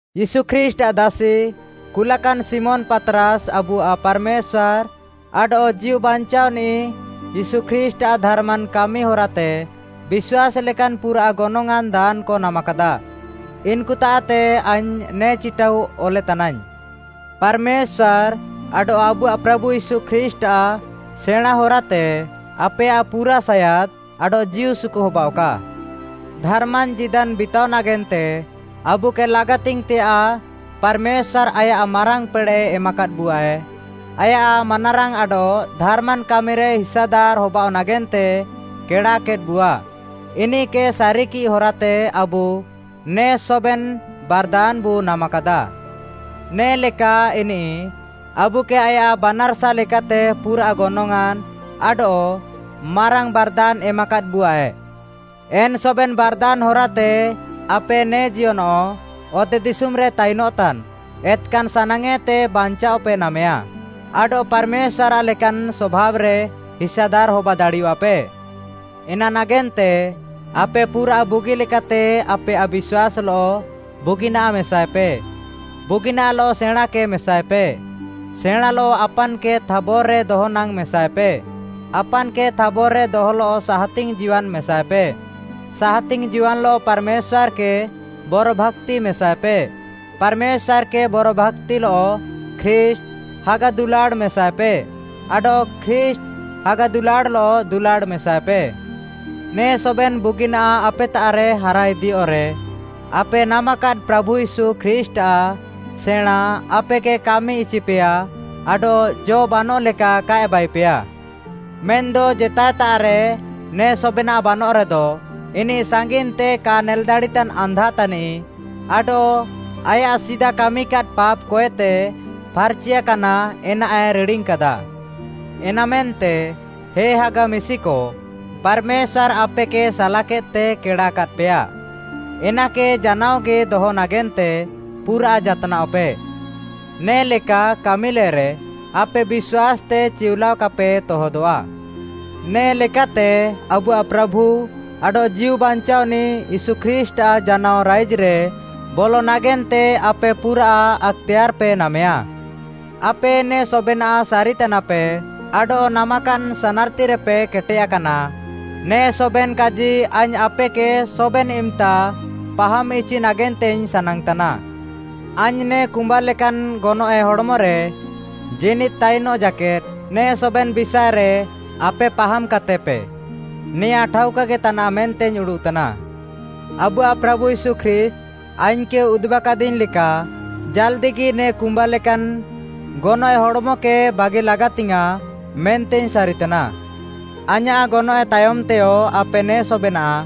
ୟୀଶୁ ଖ୍ରୀଷ୍ଟ୍‌ଆଃ ଦାସି, କୁଲାକାନ୍‌ ଶିମୋନ୍‌ ପାତ୍‌ରାସ୍‌ ଆବୁଆଃ ପାର୍‌ମେଶ୍ୱାର୍‌ ଆଡଃ ଜୀଉବାଞ୍ଚାଅନିଃ ୟୀଶୁ ଖ୍ରୀଷ୍ଟ୍‌ଆଃ ଧାର୍‌ମାନ୍‌ କାମି ହରାତେ ବିଶ୍ୱାସ୍‌ ଲେକାନ୍‌ ପୁରାଃ ଗନଙ୍ଗ୍‌ଆଁନ୍‌ ଦାନ୍‌କ ନାମାକାଦା, ଇନ୍‌କୁତାଃତେ ଆଇଙ୍ଗ୍‌ ନେ ଚିଟାଉ ଅଲେତାନାଇଙ୍ଗ୍‌। ପାର୍‌ମେଶ୍ୱାର୍‌ ଆଡଃ ଆବୁଆଃ ପ୍ରାଭୁ ୟୀଶୁ ଖ୍ରୀଷ୍ଟ୍‌ଆଃ ସେଣାଁଁ ହରାତେ ଆପେୟାଃ ପୁରା ସାୟାଦ୍‌ ଆଡଃ ଜୀଉସୁକୁ ହବାଅଃକା। ଧାର୍‌ମାନ୍‌ ଜୀଦାନ୍‌ ବିତାଅ ନାଗେନ୍ତେ ଆବୁକେ ଲାଗାତିଙ୍ଗ୍‌ତେୟାଃ ପାର୍‌ମେଶ୍ୱାର୍‌ ଆୟାଃ ମାରାଙ୍ଗ୍‌ ପେଡ଼େଃ ଏମାକାଦ୍‌ବୁଆଏ। ଆୟାଃ ମାନାରାଙ୍ଗ୍‌ ଆଡଃ ଧାର୍‌ମାନ୍‌ କାମିରେ ହିସାଦାର୍‌ ହବାଅଃ ନାଗେନ୍ତେ କେଡ଼ାକେଦ୍‌ବୁଆ। ଇନିଃକେ ସାରିକିଃ ହରାତେ ଆବୁ ନେ ସବେନ୍‌ ବାର୍‌ଦାନ୍‌ବୁ ନାମାକାଦା। ନେ'ଲେକା ଇନିଃ ଆବୁକେ ଆୟାଃ ବାନାର୍‌ସା ଲେକାତେ ପୁରାଃ ଗନଙ୍ଗ୍‌ଆଁନ୍‌ ଆଡଃ ମାରାଙ୍ଗ୍‌ ବାର୍‌ଦାନ୍‌ ଏମାକାଦ୍‌ବୁଆଏ, ଏନ୍‌ ସବେନ୍‌ ବାର୍‌ଦାନ୍‌ ହରାତେ ଆପେ ନେ ଜିୟନଃ ଅତେଦିଶୁମ୍‌ରେ ତାଇନଃତାନ୍‌ ଏତ୍‌କାନ୍‌ ସାନାଙ୍ଗ୍‌ଏତେ ବାଞ୍ଚାଅପେ ନାମେୟା, ଆଡଃ ପାର୍‌ମେଶ୍ୱାର୍‌ଆଃ ଲେକାନ୍‌ ସଭାବ୍‌ରେ ହିସାଦାର୍‌ ହବା ଦାଡ଼ିୟଃଆପେ। ଏନା ନାଗେନ୍ତେ, ଆପେ ପୁରାଃ ବୁଗିଲେକାତେ ଆପେୟାଃ ବିଶ୍ୱାସ୍‌ଲଃ ବୁଗିନାଃ ମେସାଏପେ, ବୁଗିନାଃଲଃ ସେଣାଁଁକେ ମେସାଏପେ, ସେଣାଁଁଲଃ ଆପାନ୍‌କେ ଥାବର୍‌ ଦହନାଙ୍ଗ୍‌ ମେସାଏପେ, ଆପାନ୍‌କେ ଥାବର୍‌ରେ ଦହଲଃ ସାହାତିଙ୍ଗ୍‌ ଜୀୱାନ୍‌ ମେସାଏପେ, ସାହାତିଙ୍ଗ୍‌ ଜୀୱାନ୍‌ଲଃ ପାର୍‌ମେଶ୍ୱାର୍‌କେ ବରଭାକ୍ତି ମେସାଏପେ, ପାର୍‌ମେଶ୍ୱାର୍‌କେ ବରଭାକ୍ତିଲଃ ଖ୍ରୀଷ୍ଟ୍‌ ହାଗା ଦୁଲାଡ଼୍‌ ମେସାଏପେ, ଆଡଃ ଖ୍ରୀଷ୍ଟ୍‌ ହାଗା ଦୁଲାଡ଼୍‌ଲଃ ଦୁଲାଡ଼୍‌ ମେସାଏପେ। ନେ ସବେନ୍‌ ବୁଗିନାଃ ଆପେତାଃରେ ହାରାଇଦିୟଃରେ, ଆପେ ନାମାକାଦ୍‌ ପ୍ରାଭୁ ୟୀଶୁ ଖ୍ରୀଷ୍ଟ୍‌ଆଃ ସେଣାଁଁ ଆପେକେ କାମି ଇଚିପେୟା ଆଡଃ ଜ ବାନଃଲେକା କାଏ ବାଇପେୟା। ମେନ୍‌ଦ ଜେତାଏତାଃରେ ନେ ସବେନାଃ ବାନଃରେଦ, ଇନିଃ ସାଙ୍ଗିନ୍‌ତେ କା ନେଲ୍‌ ଦାଡ଼ିତାନ୍‌ ଆନ୍ଧା ତାନିଃ ଆଡଃ ଆୟାଃ ସିଦା କାମିକାଦ୍‌ ପାପ୍‌କଏତେ ଫାର୍‌ଚିଆକାନା ଏନାଏ ରିଡ଼ିଙ୍ଗ୍‌କାଦା। ଏନାମେନ୍ତେ, ହେ ହାଗା ମିଶିକ, ପାର୍‌ମେଶ୍ୱାର୍‌ ଆପେକେ ସାଲାକେଦ୍‌ତେ କେଡ଼ାକାଦ୍‌ପେୟା, ଏନାକେ ଜାନାଅଗି ଦହ ନାଗେନ୍ତେ ପୁରାଃ ଜାତ୍‌ନାଅଃପେ। ନେ'ଲେକା କାମିଲେରେ ଆପେ ବିଶ୍ୱାସ୍‌ତେ ଚିଉଲାଅ କାପେ ତହଦଃଆ। ନେ ଲେକାତେ ଆବୁଆଃ ପ୍ରାଭୁ ଆଡଃ ଜୀଉବାଞ୍ଚାଅନିଃ ୟୀଶୁ ଖ୍ରୀଷ୍ଟ୍‌ଆଃ ଜାନାଅ ରାଇଜ୍‌ରେ ବଲ ନାଗେନ୍ତେ ଆପେ ପୁରା ଆକ୍‌ତେୟାର୍‌ପେ ନାମେୟା। ଆପେ ନେ ସବେନାଃ ସାରିତାନାପେ ଆଡଃ ନାମାକାଦ୍‌ ସାନାର୍‌ତିରେପେ କେଟେୟାକାନା, ନେ ସବେନ୍‌ କାଜି ଆଇଙ୍ଗ୍‌ ଆପେକେ ସବେନ୍‌ ଇମ୍‌ତା ପାହାମ୍‌ଇଚି ନାଗେନ୍ତେଇଙ୍ଗ୍‌ ସାନାଙ୍ଗ୍‌ତାନା। ଆଇଙ୍ଗ୍‌ ନେ କୁମ୍ବା ଲେକାନ୍‌ ଗନଏଃ ହଡ଼୍‌ମରେ ଜୀନିଦ୍‌ ତାଇନଃ ଜାକେଦ୍‌, ନେ ସବେନ୍‌ ବିଷାଏରେ ଆପେ ପାହାମ୍‌କାତେପେ ନେଆଁ ଠାଉକାଗି ତାନାଃ ମେନ୍ତେଇଙ୍ଗ୍‌ ଉଡ଼ୁଃତାନା। ଆବୁଆଃ ପ୍ରାଭୁ ୟୀଶୁ ଖ୍ରୀଷ୍ଟ୍‌ ଆଇଙ୍ଗ୍‌କେ ଉଦୁବାକାଦିଙ୍ଗ୍‌ ଲେକା ଜାଲ୍‌ଦିଗି ନେ କୁମ୍ବା ଲେକାନ୍‌ ଗନଏଃ ହଡ଼୍‌ମକେ ବାଗି ଲାଗାତିୟାଁ ମେନ୍ତେଇଙ୍ଗ୍‌ ସାରିତାନା। ଆଇଁୟାଃ ଗନଏଃ ତାୟମ୍‌ତେୟ ଆପେ ନେ ସବେନାଃ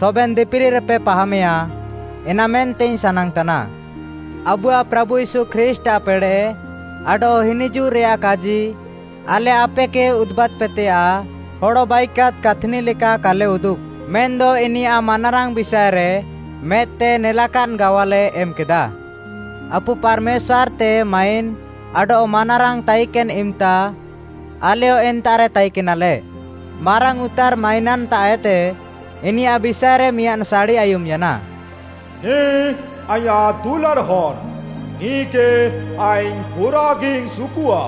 ସବେନ୍‌ ଦିପିଲିରେପେ ପାହାମେୟା, ଏନାମେନ୍ତେଇଙ୍ଗ୍‌ ସାନାଙ୍ଗ୍‌ତାନା। ଆବୁଆଃ ପ୍ରାଭୁ ୟୀଶୁ ଖ୍ରୀଷ୍ଟ୍‌ଆଃ ପେଡ଼େଃ ଆଡଃ ହିନିଜୁଃରେଆଃ କାଜି, ଆଲେ ଆପେକେ ଉଦୁବାଦ୍‌ପେତେୟାଃ ହଡ଼ ବାଇକାଦ୍‌ କାଥ୍‌ନି ଲେକା କାଲେ ଉଦୁବ୍‌, ମେନ୍‌ଦ ଇନିୟାଃ ମାନାରାଙ୍ଗ୍‌ ବିଷାଏରେ ମେଦ୍‌ତେ ନେଲାକାଦ୍‌ ଗାୱାଲେ ଏମ୍‌କେଦା। ଆପୁ ପାର୍‌ମେଶ୍ୱାର୍‌ତେ ମାଇନ୍‌ ଆଡଃ ମାନାରାଙ୍ଗ୍‌ ତାଇକେନ୍‌ ଇମ୍‌ତା ଆଲେୟ ଏନ୍ତାଃରେ ତାଇକେନାଲେ। ମାରାଙ୍ଗ୍‌ଉତାର୍‌ ମାଇନାନ୍‌ତାଃଏତେ ଇନିୟାଃ ବିଷାଏରେ ମିଆଁଦ୍‌ ସାଡ଼ି ଆୟୁମ୍‌ୟାନା, “ନିଃ ଆଇଁୟାଃ ଦୁଲାଡ଼୍‌ ହନ୍‌, ନିଃକେ ଆଇଙ୍ଗ୍‌ ପୁରାଃଗିଇଙ୍ଗ୍‌ ସୁକୁଃଆ।”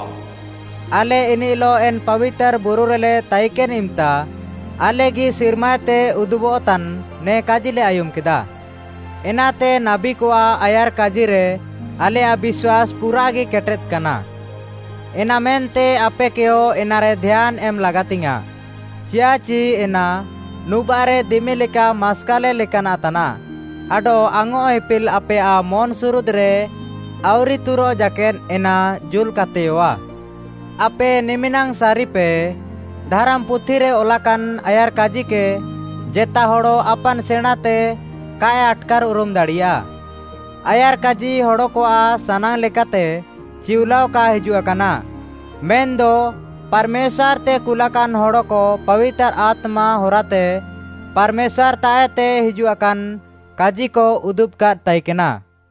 ଆଲେ ଇନିଃଲଃ ଏନ୍‌ ପାବିତାର୍‌ ବୁରୁରେଲେ ତାଇକେନ୍‌ ଇମ୍‌ତା, ଆଲେଗି ସିର୍ମାଏତେ ଉଦୁବଃତାନ୍‌ ନେ କାଜିଲେ ଆୟୁମ୍‌କେଦା। ଏନାତେ ନାବୀକଆଃ ଆୟାର୍‌କାଜିରେ ଆଲେୟାଃ ବିଶ୍ୱାସ୍‌ ପୁରାଃଗି କେଟେଦ୍‌କାନା। ଏନାମେନ୍ତେ ଆପେକେୟ ଏନାରେ ଧ୍ୟାନ୍‌ ଏମ୍‌ ଲାଗାତିଙ୍ଗ୍‌ୟାଁଃ, ଚିୟାଃଚି ଏନା ନୁବାଃରେ ଦିମି ଲେକା ମାସ୍କାଲେ ଲେକାନାଃ ତାନାଃ ଆଡଃ ଆଙ୍ଗ୍‌ଅଃ ଇପିଲ୍‌ ଆପେୟାଃ ମନ୍‌ସୁରୁଦ୍‌ରେ ଆଉରି ତୁରଃ ଜାକେଦ୍‌ ଏନା ଜୁଲ୍‌କାତେୟଃଆ। ଆପେ ନିମିନାଙ୍ଗ୍‌ ସାରିପେ, ଧାରାମ୍‌ପୁଥିରେ ଅଲାକାନ୍‌ ଆୟାର୍‌କାଜିକେ, ଜେତା ହଡ଼ ଆପାନ୍‌ ସେଣାଁଁତେ କାଏ ଆଟ୍‌କାର୍‌ଉରୁମ୍‌ ଦାଡ଼ିୟା। ଆୟାର୍‌କାଜି ହଡ଼କଆଃ ସାନାଙ୍ଗ୍‌ ଲେକାତେ ଚିଉଲାଅ କା ହିଜୁଆକାନା, ମେନ୍‌ଦ ପାର୍‌ମେଶ୍ୱାର୍‌ତେ କୁଲାକାନ୍‌ ହଡ଼କ ପାବିତାର୍‌ ଆତ୍ମା ହରାତେ ପାର୍‌ମେଶ୍ୱାର୍‌ତାଃଏତେ ହିଜୁଆକାନ୍‌ କାଜିକ ଉଦୁବ୍‌କାଦ୍‌ ତାଇକେନା।